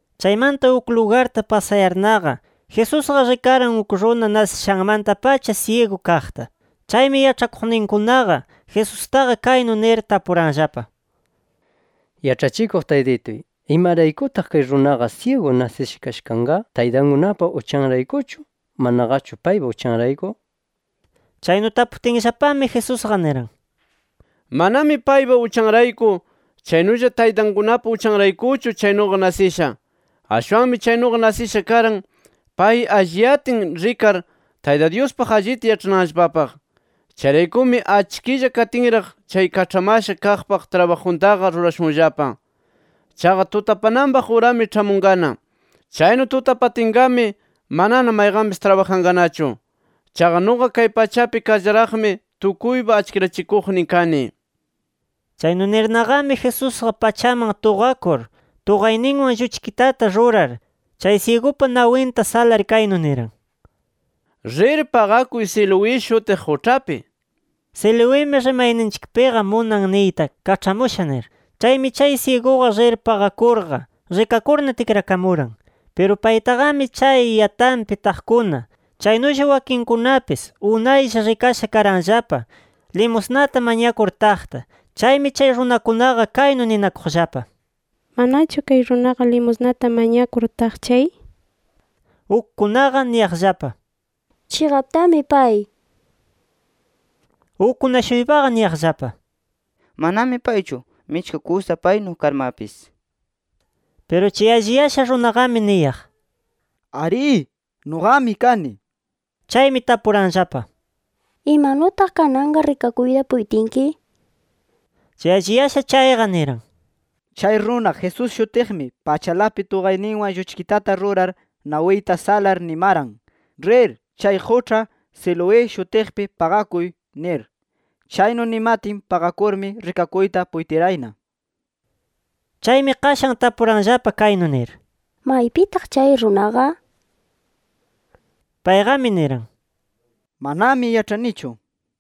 Chaymanta uk lugarta pasayarnaqa, Jesusqa rikaran uk runa nasishanmanta-pacha syigu kaqta. Chaymi yaĉhakuqninkunaqa Jesustaqa kaynu nir tapuranllapa: —Yaĉhachikuq Taytituy, ¿imaraykutaq kay runaqa syigu nasisha kasha kanqa, taytankunapa uchanraykuchu, manaqachu paypa uchanrayku? Chaynu taputinllapami, Jesusqa niran: —Manami paypa uchanrayku, chaynulla taytankunapa uchanraykuchu chaynuqa nasisha. Ashwanmi chaynuqa nasisha karan pay alliyatin rikar, Tayta Dyuspaq allita yaĉhananllapapaq. Chayraykumi achkilla katinraq chay kaĉhamasha kaqpa trabajuntaqa rurashunllapa. Chaqa tutapananpaq urami ĉhamunqana. Chaynu tutapatinqami manana mayqanpis trabajanqanachu. Chaqa nuqa kay pachapi karllaraqmi, tukuypa achkirachikuqnin kani nir. Chaynu nirnaqami Jesusqa pachaman tuqakur, tuqayninwan lluchkitata rurar, chay syigupa nawinta salar kaynu niran: —Rir paqakuy Siloé shutiq quĉhapi. (Siloimi, rimayninchikpiqa munan niyta ‘Kaĉhamusha’ nir). Chaymi chay syiguqa rir paqakurqa, rikakurna tikrakamuran. Piru paytaqami chay yatanpi taqkuna, chaynulla wakinkunapis unaylla rikasha karanllapa limusnata mañakur taqta. Chaymi chay runakunaqa kaynu ninakuqllapa: “¿Manachu kay runaqa limusnata mañakur taq chay?” nir. Ukkunaqa niyaqllapa: “Chiqaptami pay” nir. Ukkuna-shuypaqa niyaqllapa: “Manami paychu. Michka kusa paynu karmapis” nir. Piru chay alliyasha runaqami niyaq: “Arí, nuqami kani” nir. Chaymi tapuranllapa: —¿Imanutaq kananqa rikakuyta puytinki? nir. Chay alliyasha chayqa, niran: —Chay runa Jesús shutiqmi pachalapi tuqayninwan lluchkitata rurar, nawiyta salar nimaran: ‘Rir chay quĉha Siloé shutiqpi paqakuy’ nir. Chaynu nimatin paqakurmi, rikakuyta puytirayna. Chaymi qashan tapuranllapa kaynu nir: —¿Maypitaq chay runaqa? Payqami niran: —Manami yaĉhanichu nir.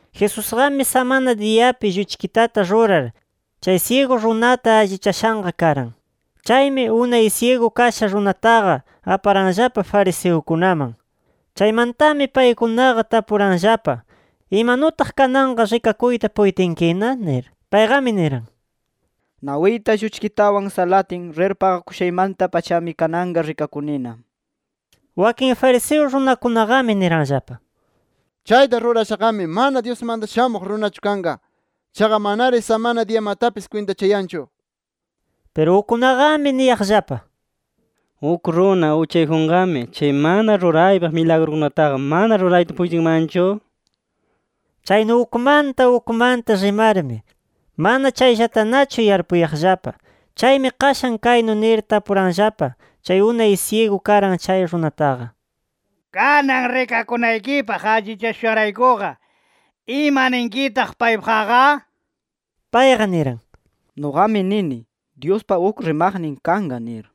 Jesusqami samana diyapi lluchkitata rurar, chay syigu runata allichashanqa karan. Chaymi, unay syigu kasha runataqa aparanllapa fariseukunaman. Chaymantami, paykunaqa tapuranllapa: —¿Imanutaq kananqa rikakuyta puytinkina? nir. Payqami niran: —Nawiyta lluchkitawan salatin, rir paqakushaymanta-pachami kananqa rikakunina. Wakin fariseo runakunaqami niranllapa: —Chayta rurashaqami mana Dyusmanta Shamuq Runachu kanqa. Chaqa manari samana diyamatapis kwintachayanchu nir. Piru ukkunaqami niyaqllapa: —¿Uk runa uchayjunqami chay mana ruraypaq milagrukunataqa mana rurayta puytinmanchu? Chaynu ukmanta ukmanta rimarmi, mana chayllatanachu yarpuyaqllapa. Chaymi qashan kaynu nir tapuranllapa chay unay syigu karan chay runataqa: —Kanan rikakunaykipaq allichashushanraykuqa, ¿imaninkitaq paypaqqa? Payqa niran: —Nuqami nini, Dyuspa uk rimaqnin kanqa nir.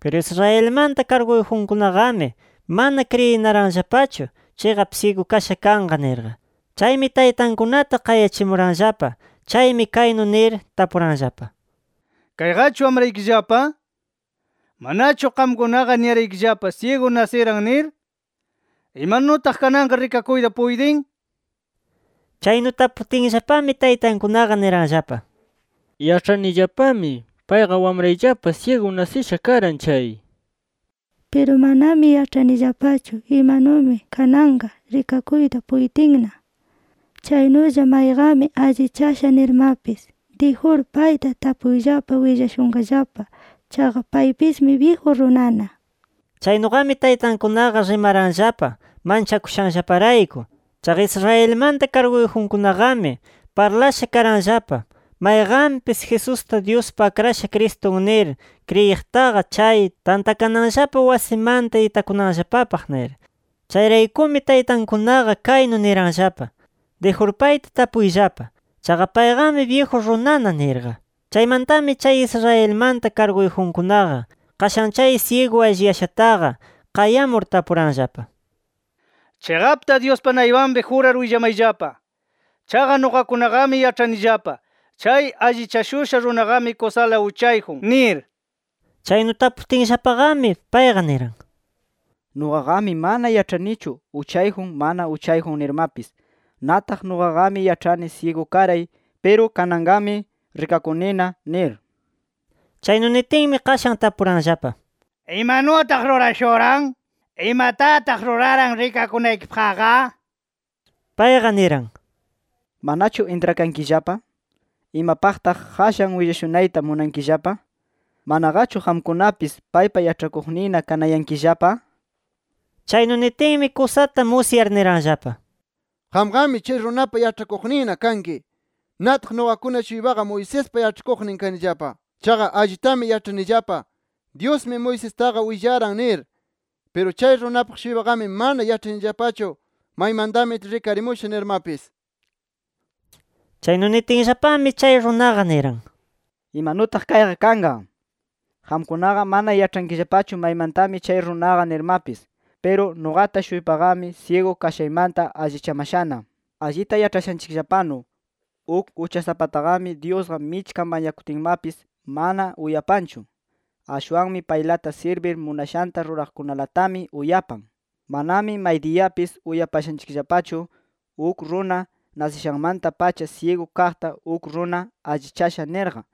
Piru Israelmanta karguyjunkunaqami mana kriyinaranllapachu chiqap syigu kasha kanqa nirqa. Chaymi, taytankunata qayachimuranllapa. Chaymi kaynu nir tapuranllapa: —¿Kayqachu wamraykillapa? ¿Manachu qamkunaqa niraykillapa syigu nasiran nir? ¿Imanutaq kananqa rikakuyta puytin? nir. Chaynu taputinllapami, taytankunaqa niranllapa: —Yaĉhanillapami payqa wamrayllapa syigu nasisha karan chay nir. Piru manami yaĉhanillapachu imanumi kananqa rikakuyta puytinna, chaynulla mayqanmi allichasha nirmapis. Dijur payta tapuyllapa willashunqallapa. Chaqa paypismi byiju runana nir. Chaynuqami taytankunaqa rimaranllapa manchakushanllaparayku. Chaqa Israelmanta karguyjunkunaqami parlasha karanllapa, mayqanpis Jesusta Dyuspa Akrashan Cristun nir kriyiqtaqa chay tantakananllapa wasimanta itakunanllapapaq nir. Chayraykumi, taytankunaqa kaynu niranllapa: “Dijur payta tapuyllapa. Chaqa payqami byiju runana” nirqa. Chaymantami chay Israelmanta karguyjunkunaqa, qashan chay syigu alliyashataqa, qayamur tapuranllapa: —Chiqapta Dyuspa naypanpi jurar willamayllapa. Chaqa nuqakunaqami yaĉhanillapa chay allichashusha runaqami kusala uchayjun nir. Chaynu taputinllapami, payqa niran: —Nuqaqami mana yaĉhanichu uchayjun mana uchayjun nirmapis. Nataq nuqaqami yaĉhani syigu karay, piru kananqami rikakunina nir. Chaynu nitinmi, qashan tapuranllapa: —¿Imanutaq rurashuran? ¿Imatataq ruraran rikakunaykipaqqa? nir. Payqa niran: —Willashurayllapanami, ¿manachu intrakankillapa? ¿Imapaqtaq qashan willashunayta munankillapa? ¿Manaqachu qamkunapis paypa yaĉhakuqninna kanayankillapa? nir. Chaynu nitinmi, kusata musyar niranllapa: —Qamqami chay runapa yaĉhakuqninna kanki. Nataq nuqakuna-shuypaqa Moisespa yaĉhakuqnin kanillapa. Chaqa allitami yaĉhanillapa, Dyusmi Moisestaqa willaran nir. Piru chay runapaq-shuypaqami mana yaĉhanillapachu maymantami rikarimusha nirmapis. Chaynu nitinllapami, chay runaqa niran: —¡Imanutaq kayqa kanqa! Qamkunaqa mana yaĉhankillapachu maymantami chay runaqa nirmapis. Piru nuqata-shuypaqami syigu kashaymanta allichamashana. Allita yaĉhashanchikllapanu, uk uchasapataqami Dyusqa michka mañakutinmapis mana uyapanchu. Ashwanmi paylata sirbir, munashanta ruraqkunalatami uyapan. Manami maydiyapis uyashanchikllapachu, uk runa nasishanmanta-pacha syigu kaqta uk runa allichasha nirqa.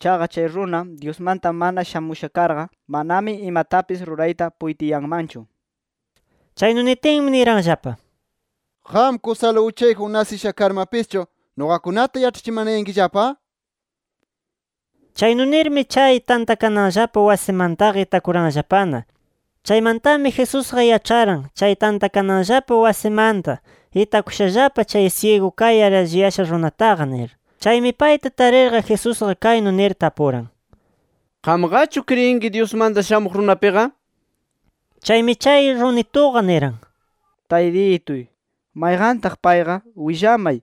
Chaqa chay runa, Dyusmanta mana shamusha karqa, manami imatapis rurayta puytiyanmanchu nir. Chaynu nitinmi, niranllapa: —Qam kusala uchayjun nasisha karmapischu, ¿nuqakunata yaĉhachimanayankillapa? nir. Chaynu nirmi, chay tantakananllapa wasimantaqa itakuranllapana. Chaymantami Jesusqa yaĉharan chay tantakananllapa wasimanta itakushallapa chay syigu kayar alliyasha runataqa nir. Chaymi, payta tarirqa Jesusqa kaynu nir tapuran: —¿Qamqachu kriyinki Dyusmanta Shamuq Runapiqa? nir. Chaymi chay runituqa niran: —Taytituy, mayqantaq payqa willamay,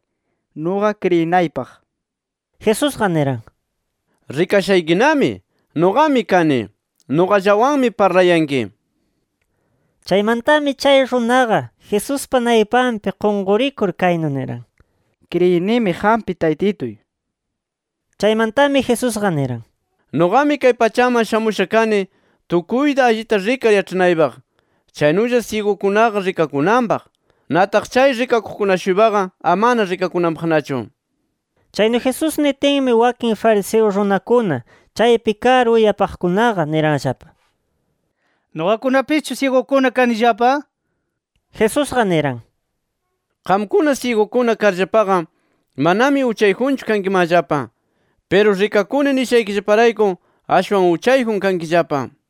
nuqa kriyinaypaq nir. Jesusqa niran: —Rikashaykinami. Nuqami kani. Nuqallawanmi parlayanki nir. Chaymantami chay runaqa, Jesuspa naypanpi qunqurikur kaynu niran: —Kriyinimi qampi Taytituy nir. Chaymantami Jesusqa niran: —Nuqami kay pachaman shamusha kani tukuyta allita rikar yaĉhanaypaq. Chaynulla syigukunaqa rikakunanpaq. Nataq chay rikakuqkuna-shuypaqa amana rikakunanpaqnachu nir. Chaynu Jesús nitinmi, wakin fariseo runakuna chaypi kar, uyakuqkunaqa niranllapa: —¿Nuqakunapischu syigukuna kanillapa? nir. Jesusqa niran: —Qamkuna syigukuna karllapaqa, manami uchayjunchu kankimanllapa. Piru rikakuni nishaykillaparayku, ashwan uchayjun kankillapa nir.